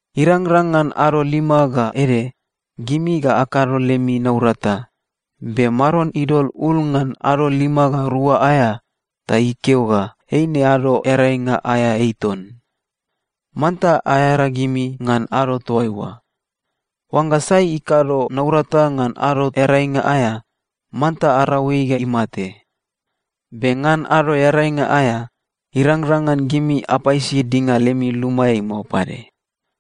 Irangrang ngan ado lima ga ede, gimi ga akado lemi naurata, be Maron idol ul ngan ado lima ga rua aea, ta ikeo ga eine Ado Earainga aea ei ton. Manta aearagimi ngan ado toaiua. Oangga sai ikado naurata ngan Ado Earainga aea, manta arau ei ga imate. Be ngan Ado Earainga aea, irangrang ngan gimi apaisi dinga lemi lumaeai mao pade.”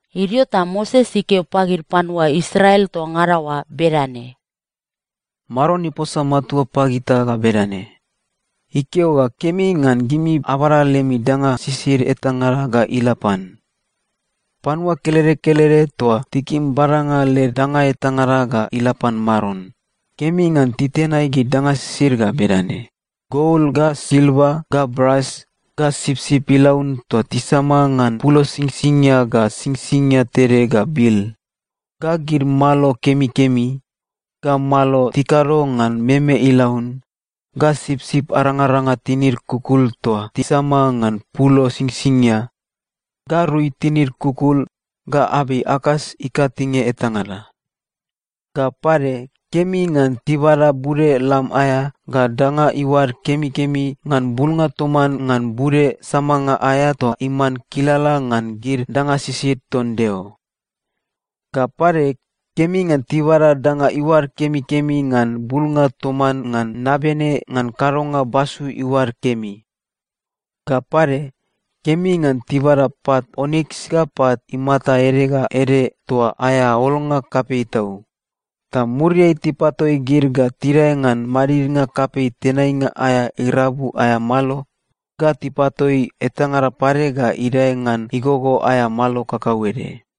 Idio ta Moses ikeo pagid panua Israel toa ngada oa bedane, “Maron iposa matua pagita ga bedane: Ikeo ga kemi ngan gimi abada lemi danga sisid etangada ga ila pan. Panua kelede kelede toa tikim badanga led danga etangada ga ila pan Maron, kemi ngan titenai gid danga sisid ga bedane: gol, ga silva, ga bras, ga sipsip ilaun toa tisama ngan pulo singsingia ga singsingia tede ga bil, ga gid malo kemikemi, ga malo tikado ngan meme ilaun, ga sipsip arangaranga tinid kukul toa tisama ngan pulo singsingia, ga rui tinid kukul, ga abei akas ikatinge etangada. Ga pade, kemi ngan tibada bude lam aea ga danga iuad kemikemi ngan bulnga toman ngan bude samanga aea toa iman kilala ngan gid danga sisid ton Deo. Ga pade, kemi ngan tibada danga iuad kemikemi ngan bulnga toman ngan nabene ngan kadonga basu iuad kemi. Ga pade, kemi ngan tibada pat oniks ga pat imata ede ga ede toa aea olnga kapei tau, ta muriai tipatoi gid ga tidae ngan madidnga kapei tenainga aea irabu aea malo, ga tipatoi etangada pade ga idae ngan igogo aea malo kakauede.”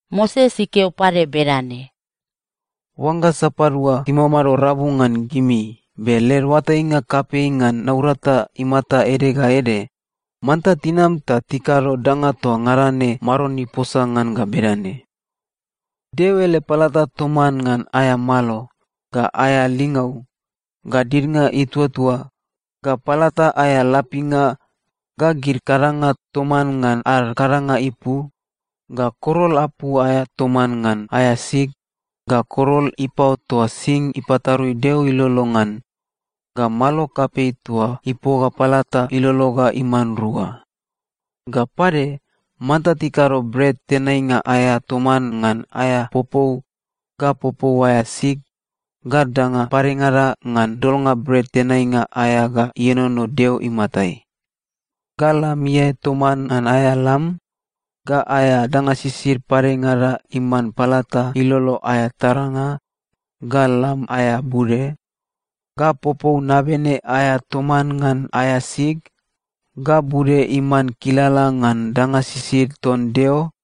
Moses ikeo pade bedane, “Oangga sapadua timamado rabu ngan gimi be led oatainga kapei ngan naurata imata ede ga ede, manta tinam ta tikado danga toa ngada ne Maron iposa ngan ga bedane: Deo ele palata toman ngan aea malo, ga aea lingau, ga didnga ituatua, ga palata aea lapinga, ga gid kadanga toman ngan ad kadanga ipu, ga korol apu aea toman ngan aea sig, ga korol ipao toa sing ipatarui Deo ilolo ngan, ga malo kapei toa ipoga palata ilolo ga iman rua. Ga pade, manta tikado bret tenainga aea toman ngan aea popou, ga popou aea sig, ga danga padengada ngan dolnga bret tenainga aea ga ienono Deo imatai, ga lam iae toman ngan aea lam, ga aea danga sisid padengada iman palata ilolo aea taranga, ga lam aea bude, ga popou nabene aea toman ngan aea sig, ga bude iman kilala ngan danga sisid ton Deo,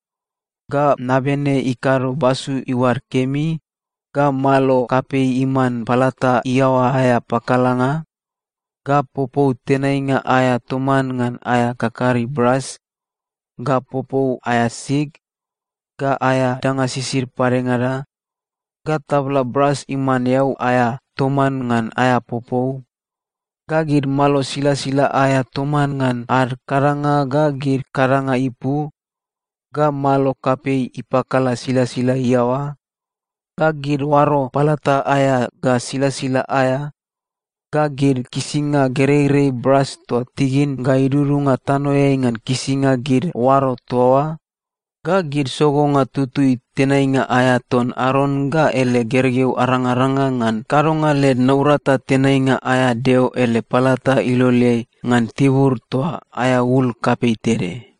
ga nabene ikado basu iuad kemi, ga malo kapei iman palata iaoa aea pakalanga, ga popou tenainga aea toman ngan aea kakari bras, ga popou aea sig, ga aea danga sisid padengada, ga tabla bras iman eau aea toman ngan aea popou, ga gid malo silasila aea toman ngan ad kadanga ga gid kadanga ipu, ga malo kapei ipakala silasila iaoa, ga gid oaro palata aea ga silasila aea, ga gid kisinga gereirei bras toa tigin ga idudunga tanoeai ngan kisinga gid oaro toa oa, ga gid sogonga tutui tenainga aea ton Aron ga ele gergeu arangaranga ngan kadonga led naurata tenainga aea Deo ele palata iloleai ngan tibur toa aea ul kapei tede.”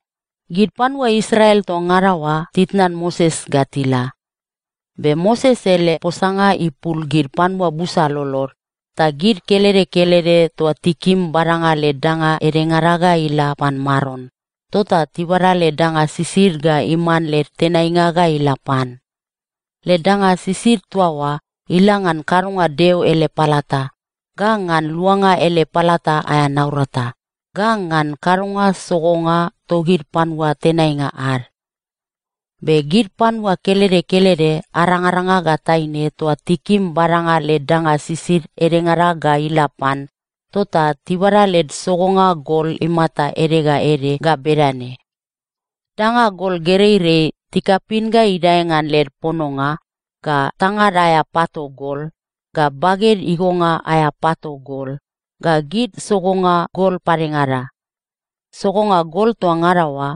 Gid panua Israel toa ngada oa titnan Moses ga tila. Be Moses ele posanga ipul gid panua busa lolod, ta gid kelede kelede toa tikim badanga led danga edengada ga ila pan Maron, tota tibada led danga sisid ga iman led tenainga ga ila pan. Led danga sisid toa oa, ila ngan kadonga Deo ele palata, ga ngan luanga ele palata aea naurata, ga ngan kadonga sogonga togid panua tenainga ad. Be gid panua kelede kelede arangaranga ga taine toa tikim badanga led danga sisid edengada ga ila pan, tota tibada led sogonga gol imata ede ga ede ga bedane: danga gol gereirei tikapin ga idae ngan led pononga, ga tangad aea pato gol, ga baged igonga aea pato gol, ga gid sogonga gol padengada. Sogonga gol toa ngada oa,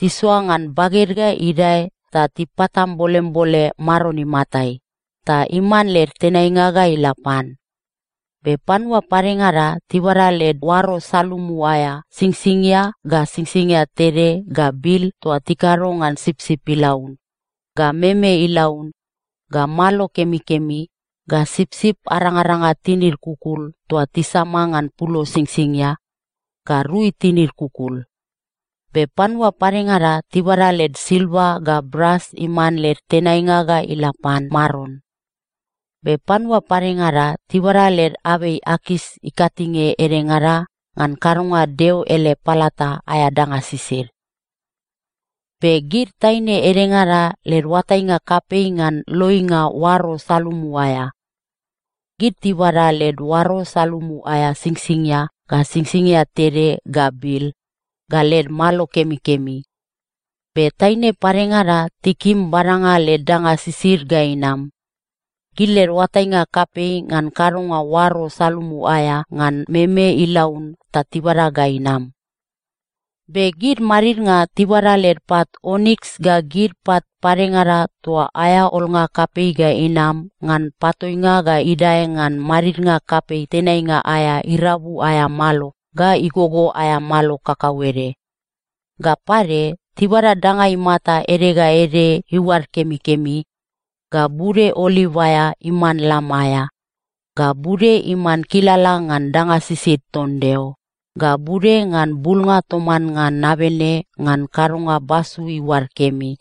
tisoa ngan baged ga idae ta tipatambolembole Maron imatai, ta iman led tenainga ga ila pan. Be panua padengada tibada led oaro salumu aea singsingia ga singsingia tede ga bil toa tikado ngan sipsip ilaun, ga meme ilaun, ga malo kemikemi, ga sipsip arangaranga tinid kukul toa tisama ngan pulo singsingia, ga rui tinid kukul. Be panua padengada tibada led silva ga bras iman led tenainga ga ila pan Maron. Be panua padengada tibada led abei akas ikatinge edengada ngan kadonga Deo ele palata aea danga sisid. Be gid taine edengada led oatainga kapei ngan loinga oaro salumu aea. Gid tibada led oaro salumu aea singsingia ga singsingia tede ga bil, ga led malo kemikemi. Be taine padengada tikim badanga led danga sisid ga inam. Gid led oatainga kapei ngan kadonga oaro salumu aea ngan meme ilaun ta tibada ga inam. Be gid madidnga tibada led pat oniks ga gid pat padengada toa aea olnga kapei ga inam ngan patoinga ga idae ngan madidnga kapei tenainga aea irabu aea malo ga igogo aea malo kakauede. Ga pade, tibada danga imata ede ga ede iuad kemikemi, ga bude oliv aea iman lam aea, ga bude iman kilala ngan danga sisid ton Deo, ga bude ngan bulnga toman ngan nabene ngan kadonga basu iuad kemi.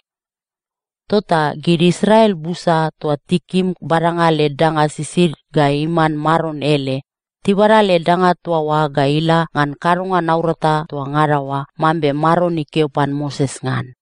Tota gid Israel busa toa tikim badanga led danga sisid ga iman Maron ele, tibada led danga toa oa ga ila ngan kadonga naurata toa ngada oa mambe Maron ikeo pan Moses ngan.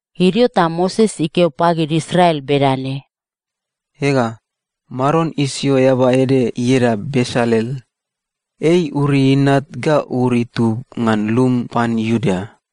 Idio ta Moses ikeo pagid Israel bedane, “Ega, Maron isio eaba ede ieda Besalel. Ei Uri inat ga Ur itub ngan lum pan Iuda.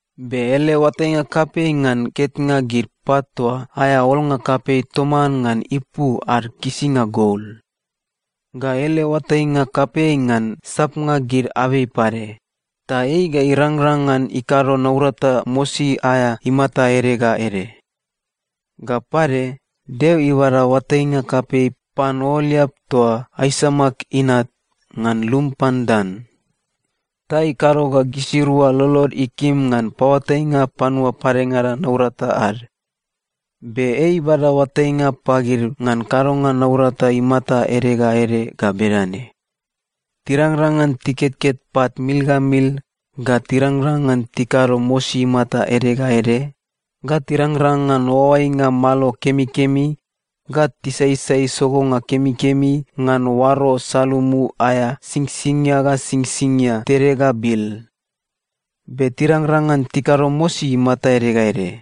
Be ele oatainga kapei ngan ketnga gid pat toa aea olnga kapei toman ngan ipu ad kisinga gol. Ga ele oatainga kapei ngan sapnga gid abei pade. Ta ei ga irangrang ngan ikado naurata mosi aea imata ede ga ede. Ga pade, Deo ibada oatainga kapei pan Ooliap toa Aisamak inat, ngan lum pan Dan. Ta ikado ga gisirua lolod ikim ngan paoatainga panua padengada naurata ad. Be ei ibada oatainga pagid ngan kadonga naurata imata ede ga ede ga bedane: Tirangrang ngan tiketket pat mil ga mil, ga tirangrang ngan tikado mosi imata ede ga ede, ga tirangrang ngan oaoainga malo kemikemi ga tisaisai sogonga kemikemi ngan oaro salumu aea singsingia ga singsingia tede ga bil. Be tirangrang ngan tikado mosi imata ede ga ede.